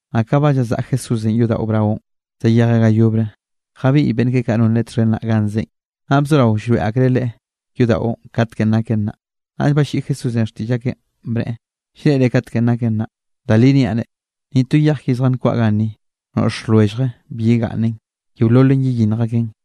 Naꞌ ka ba llazaꞌa Jesúsenꞌ yodaꞌo braonꞌ, zayejeꞌ ga yobre, jabiꞌy beꞌnn keꞌe kaꞌ non Leꞌe txhen naꞌ ganꞌ zeꞌen, naꞌ bzorao llroeꞌ akreꞌ Leꞌe yodaꞌon katkenꞌ naken naꞌ. Naꞌll balliꞌi Jesúsenꞌ xtiꞌll akeꞌn, bneꞌe: —¿Llreꞌre katkenꞌ naken naꞌ? Da li niaꞌ reꞌ, ni to yej ki zjankwaꞌa ganni, noꞌx lwellje bi yegaꞌnnen. Yeololen yeyinnj aken.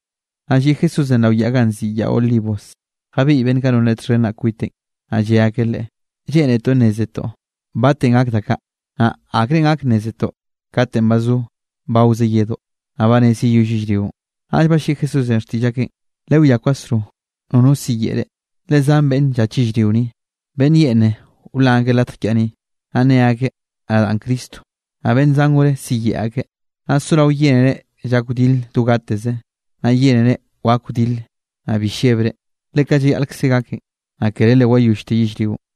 Naꞌ lliꞌ Jesúsenꞌ rao yaꞌ ganꞌ nziꞌi Yaꞌ Olivos, jabiꞌy beꞌnn kaꞌ non Leꞌe txhen naꞌ kwiteꞌn, naꞌ lle akeꞌ Leꞌe: —Lleꞌnetoꞌ nnézetoꞌ batenꞌ gak da kaꞌ. Naꞌ ¿akre gak nnézetoꞌ katenꞌ ba zo bawze yedoꞌ, naꞌ ba rez yeyoll yellrionꞌ? Naꞌll balliꞌi Jesúsenꞌ xtiꞌll akeꞌn: —Lewiá kwasro nono siyeꞌe reꞌ. Le zan beꞌnne llach yellrio ni, beꞌnn yeꞌne wlan akeꞌ latj kiaꞌ ni, naꞌ nne akeꞌ: “Nadaꞌn Cristo.” Naꞌ beꞌnn zan gore siyeꞌe akeꞌ. Naꞌ sorao yénere llak wdile do gateze, naꞌ yénere wak wdile, naꞌ bi llebre, le kaꞌ llayaꞌlkze gaken. Naꞌ kere le wayollte yellrionꞌ.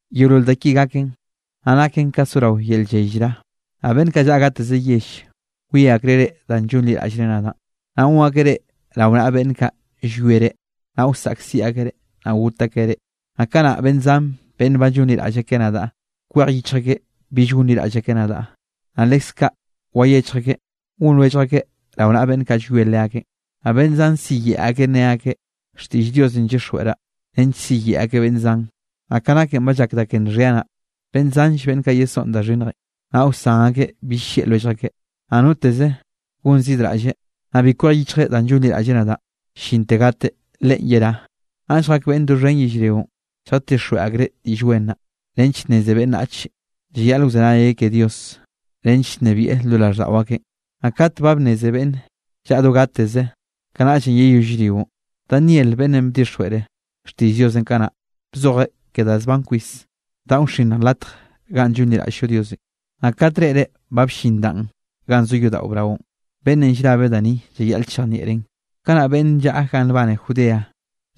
Yeolol da ki gaken, naꞌ naken ka ga zorao yel lley llra. ’Naꞌ beꞌnn kaꞌ llaꞌa gateze yell, wie akreꞌ reꞌ danꞌ llonliraꞌllre nadaꞌn, naꞌ gon akeꞌ reꞌ rao naꞌa beꞌnn kaꞌ llwie reꞌ, naꞌ wsaꞌkziꞌ akeꞌ reꞌ, naꞌ got akeꞌ reꞌ. Naꞌ kanaꞌ beꞌnn zan beꞌnn ba llonliraꞌll akeꞌ nadaꞌ, kwej yichj akeꞌ bill gonliraꞌll akeꞌ nadaꞌ. Naꞌ leskaꞌ wayechj akeꞌ gon lwellj akeꞌ rao naꞌa beꞌnn kaꞌ llwie leakeꞌn. Naꞌ beꞌnn zan siyeꞌe akeꞌ ne akeꞌ: “Xtiꞌll Diosenꞌ llyixjweꞌraꞌ”, nench siyeꞌe akeꞌ beꞌnn zan. Naꞌ ka naken ba llak da ke nxhia naꞌ, beꞌnn zanll beꞌnn kaꞌ yesoꞌn da xhinnjenꞌ, naꞌ wsan akeꞌ bill llieꞌ lwellj akeꞌ. Naꞌ noteze gonzidraꞌlle, naꞌ bi kwej yichjeꞌ danꞌ llonliraꞌlleꞌ nadaꞌn llinte gateꞌ, leꞌen yerá. Naꞌ lljak beꞌnne doxhen yellrionꞌ, lljatixjweꞌ akreꞌ Diꞌll Wen naꞌ, nench nneze beꞌnnachenꞌ llayaꞌle wzenayeꞌ ke Dios, nench nnebieꞌ lo raꞌlldaꞌo akeꞌn, naꞌ kate ba bnneze beꞌnne llaꞌa do gateze, kanaꞌllenꞌ yeyoll yellrionꞌ. ’Daniel beꞌnnenꞌ bdixjweꞌre xtiꞌll Diosenꞌ kanaꞌ, bzojeꞌ ke da zban kwis, danꞌ wxinnj latjenꞌ ganꞌ llonliraꞌll-llo Diosenꞌ. Naꞌ kat reꞌre ba bllin danꞌ ganꞌ zo yodaꞌo braonꞌ (beꞌnne llrabe da ni llayaꞌle chejnieꞌreꞌn), kanaꞌ beꞌnn llaꞌa ganꞌ nbane Judea,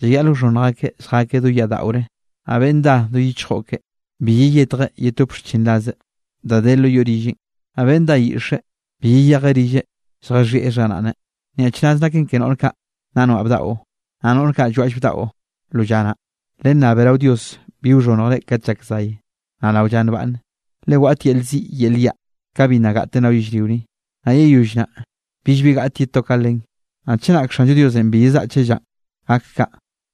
llayaꞌl wxhonnj akeꞌ lljakeꞌ do yaꞌ daꞌore. Naꞌ beꞌnn dá do yichjo keꞌe, bi yeyetjeꞌ yetop xchinraze da de lo yoꞌ rilleꞌn. Naꞌ beꞌnn dá yiꞌxe, bi yeyeje rilleꞌ lljaxhieꞌ xharaꞌne. ¡Nyaꞌchraz naken ke noꞌr kaꞌ nna noaꞌ bdaꞌo, naꞌ noꞌr kaꞌ llwaꞌll bdaꞌo lo lla naꞌ! Lennabe rao Dios bi wxhonnjre kat llak zay, naꞌ rao lla nbaꞌnne. Le waꞌt yel ziꞌ yel yaꞌ, ka bi nna gaꞌten rao yellrio ni, naꞌ yeyoll naꞌ, billbi gaꞌte ye to ka len. Naꞌ chenak Xanllo Diosenꞌ bi yezaꞌcheꞌ llanꞌ gak kaꞌ,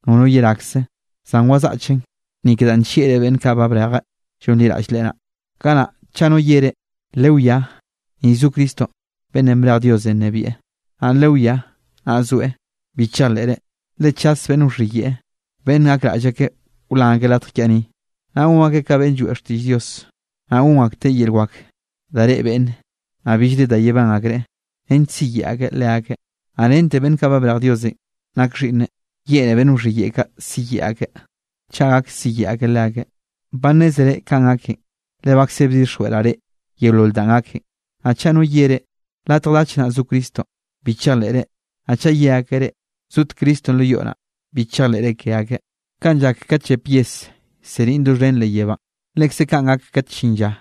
nono yerakze; zan wazaꞌcheꞌn, ni ke danꞌ nllieꞌreꞌ beꞌnn kaꞌ ba brejeꞌ llonliraꞌll Leꞌe naꞌ. ’Kanaꞌ chaꞌ no ye reꞌ: “Lewiá, ni zo Cristonꞌ beꞌnnenꞌ brej Diosenꞌ nnebieꞌ”, naꞌ “Lewiá, naꞌ zoeꞌ”, bi chejleꞌre. Le chas beꞌnn wxhiyeꞌe, beꞌnn gakraꞌll akeꞌ wlan akeꞌ latj kiaꞌ ni, naꞌ gon akeꞌ ka beꞌnn lloeꞌ xtiꞌll Dios. Naꞌ gon akteꞌ yel wak da reꞌe beꞌnne, naꞌ billre da yebán akreꞌ, nench siyeꞌe akeꞌ leakeꞌ. Naꞌ rente beꞌnn kaꞌ ba brej Diosenꞌ nak Xhiꞌnneꞌ, yeꞌne beꞌnn wxhiyeꞌe kaꞌ siyeꞌe akeꞌ, chaꞌ gak siyeꞌe akeꞌ leakeꞌ. Ba nnézere kanꞌ gaken, le bakze bdixjweꞌraꞌ reꞌ yeolol danꞌ gaken. Naꞌ chaꞌ no ye reꞌ: “Latj dach naꞌ zo Cristonꞌ”, bi chejleꞌre, naꞌ chaꞌ ye akeꞌ reꞌ: “Zot Cristonꞌ lo yoꞌ naꞌ”, bi chejleꞌre ke akeꞌ. Kanꞌ llak kat llep yes llseniꞌn doxhen leꞌ yebánꞌ, lekze kaꞌn gak kat llin lla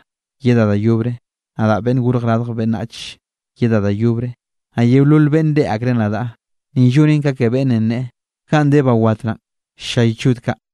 yedaꞌ da yobre, nadaꞌ Beꞌnnenꞌ Gorj Radj Beꞌnnach yedaꞌ da yobre, naꞌ yeolol beꞌnne reꞌe akreꞌ nadaꞌ. Ni llonen ka ke beꞌnnenꞌ ne: “Ganꞌ de ba wat naꞌn ll-llay chod kaꞌ.”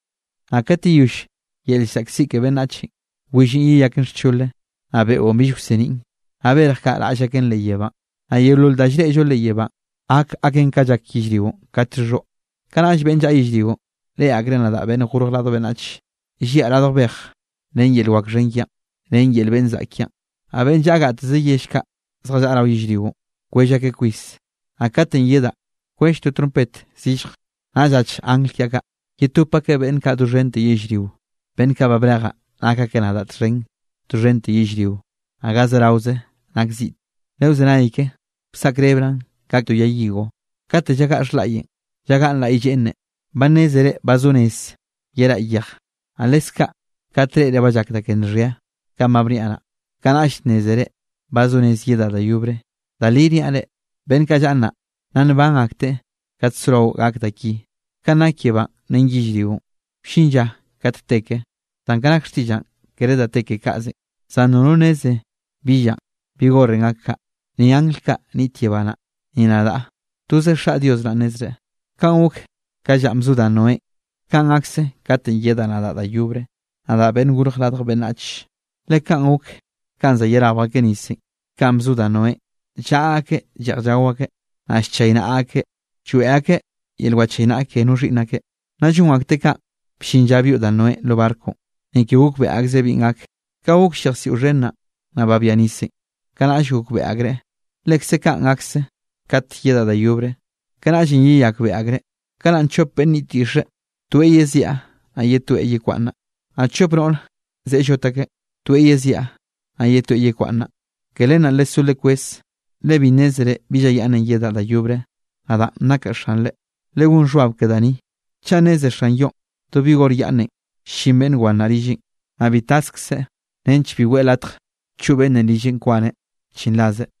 ’Naꞌ kat yeyoll yel llzaꞌkziꞌ ke beꞌnnachenꞌ, willenꞌ yeyaken xchole, naꞌ beonꞌ bill wseniꞌn, naꞌ berj kaꞌ raꞌll aken leꞌ yebánꞌ, naꞌ yeolol da llreꞌllo leꞌ yebánꞌ, gak aken ka llak yellrionꞌ kat llxhoꞌ. Kanaꞌll beꞌnn llaꞌa yellrionꞌ reꞌe akreꞌ nadaꞌ Beꞌnnenꞌ Gorj Radj Beꞌnnach, lliaꞌ radj bej ren yel wak xhen kiaꞌn ren yel beꞌnn zaꞌk kiaꞌn, naꞌ beꞌnn llaꞌa gateze yell kaꞌ zjallaꞌa rao yellrionꞌ kwell akeꞌ kwis. Naꞌ katenꞌ yedaꞌn, kwell to trompet zillje, naꞌ llach angl kiaꞌ kaꞌ, yetop akeꞌ beꞌnn kaꞌ doxhente yellrio, beꞌnn kaꞌ ba brejaꞌ nak akeꞌ nadaꞌ txhen doxhente yellrio, naꞌ ga zeraoze nak ziꞌte. ’Lewzenay ke wsaꞌkrebraꞌn ka to yay higo: Kate llagaꞌ xhlaꞌyenꞌ, llagaꞌn laꞌy lleꞌne, ba nnézere ba zo nez yeraꞌ yej. Naꞌ leskaꞌ kat reꞌre ba llak da ke nxhia, kaꞌn ba bniaꞌ naꞌ, kanaꞌll nnézere ba zo rez yedaꞌ da yobre. Da li niaꞌ reꞌ, beꞌnn kaꞌ llaꞌa nnaꞌ, nna nban akteꞌ kate sorao gak da ki. Ka nak yebánꞌ ren yellrionꞌ wllin lla kat te ke, zan ka nak xtiꞌllaꞌn kere da te ke kaꞌzenꞌ. ’Zan nono nneze bi llanꞌ, bi horenꞌ gak kaꞌ, ni angl kaꞌ niꞌt yebá naꞌ, ni nadaꞌ. Toze Xaꞌ Dios naꞌ nnezreꞌ. ’Kanꞌ gok ka llanꞌ bzo da Noénꞌ, kanꞌ gakse katenꞌ yedaꞌ nadaꞌ da yobre, nakaꞌ Beꞌnn Gorj Radj Beꞌnnach. Le kanꞌ gok kanꞌ za yerabj akeꞌ nisenꞌ, kanꞌ bzo da Noénꞌ, llaꞌa akeꞌ lleꞌj llao akeꞌ, naꞌ llchaynaꞌa akeꞌ lloeꞌ akeꞌ yel wachaynaꞌa ke no xhiꞌnn akeꞌ, nna llon akteꞌ kaꞌn bllin lla byoꞌ da Noénꞌ lo barconꞌ. Ni ke gokbeꞌe akzreꞌ binꞌ gak, ka gokll yejsiꞌo xhen naꞌ, naꞌ babia nisenꞌ, kanaꞌll gokbeꞌe akreꞌ. Lekze kaꞌn gakze kat yedaꞌ da yobre, kanaꞌllenꞌ yeyakbeꞌe akreꞌ. Kanaꞌn chop beꞌnn niꞌt yiꞌxe, toeꞌ yeziaꞌ naꞌ ye toeꞌ yekwaꞌnnaꞌ. Naꞌ chop noꞌre ze llot akeꞌ, toeꞌ yeziaꞌ naꞌ ye toeꞌ yekwaꞌnnaꞌ. ’Ke len naꞌ lesó lekweze, le bi nnézere bi lla yaꞌnne yedaꞌ da yobre, nadaꞌn nakaꞌ Xanre. Legón xhbab ke da ni, chaꞌ nneze xan yoꞌn do bi hor yaꞌnnenꞌ llin beꞌnn wan naꞌ rilleꞌn, naꞌ bi taskzeꞌ nench bi weꞌe latj choꞌ beꞌnnenꞌ rilleꞌn kwaneꞌ xchinrazeꞌ.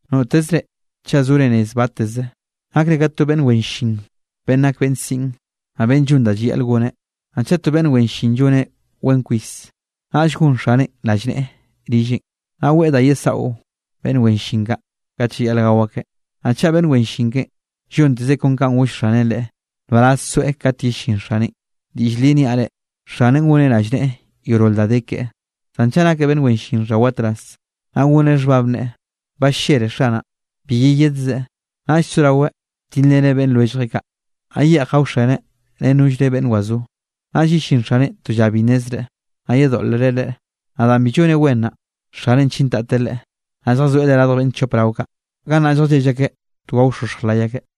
’Notezre chaꞌ zore rez batteze, nakre ka to beꞌnn wen llin beꞌnn nak beꞌnn siꞌn, naꞌ beꞌnn llon da llayaꞌl goneꞌ. Naꞌ chaꞌ to beꞌnn wen llin lloneꞌ wen kwis, naꞌll gon xaneꞌn rallneꞌe rilleꞌn, naꞌ weꞌe da yesaꞌo beꞌnn wen llin kaꞌ, kat llayaꞌl gao akeꞌ. Naꞌ chaꞌ beꞌnn wen llin keꞌen, llontezeꞌ kon kanꞌ goll xaneꞌn leꞌe, nbaraz soeꞌ kat yellín xaneꞌn. Diꞌll li niaꞌ reꞌ, xaneꞌn goneꞌ rallneꞌe yeolol da de keꞌe. Zan chaꞌ nakeꞌ beꞌnn wen llin xhawatraz, naꞌ goneꞌ xhbab neꞌe: “Ba ll-llere xanaꞌn, bi yeyedzeꞌ.” Naꞌll soraweꞌ tilreneꞌ beꞌnn lwelljeꞌ kaꞌ, naꞌ yeꞌj gaoxeneꞌ ren nollre beꞌnn wazó. Naꞌll yellín xaneꞌn to lla bi nnezreꞌ, naꞌ yedoꞌlreꞌ leꞌe. Naꞌ danꞌ bi lloneꞌ wen naꞌ, xaneꞌn chintateꞌ leꞌe, naꞌ lljazoeꞌ leꞌe radj beꞌnn chop rao kaꞌ, gannaꞌ lljallell akeꞌ to gaoxoxj lay akeꞌ.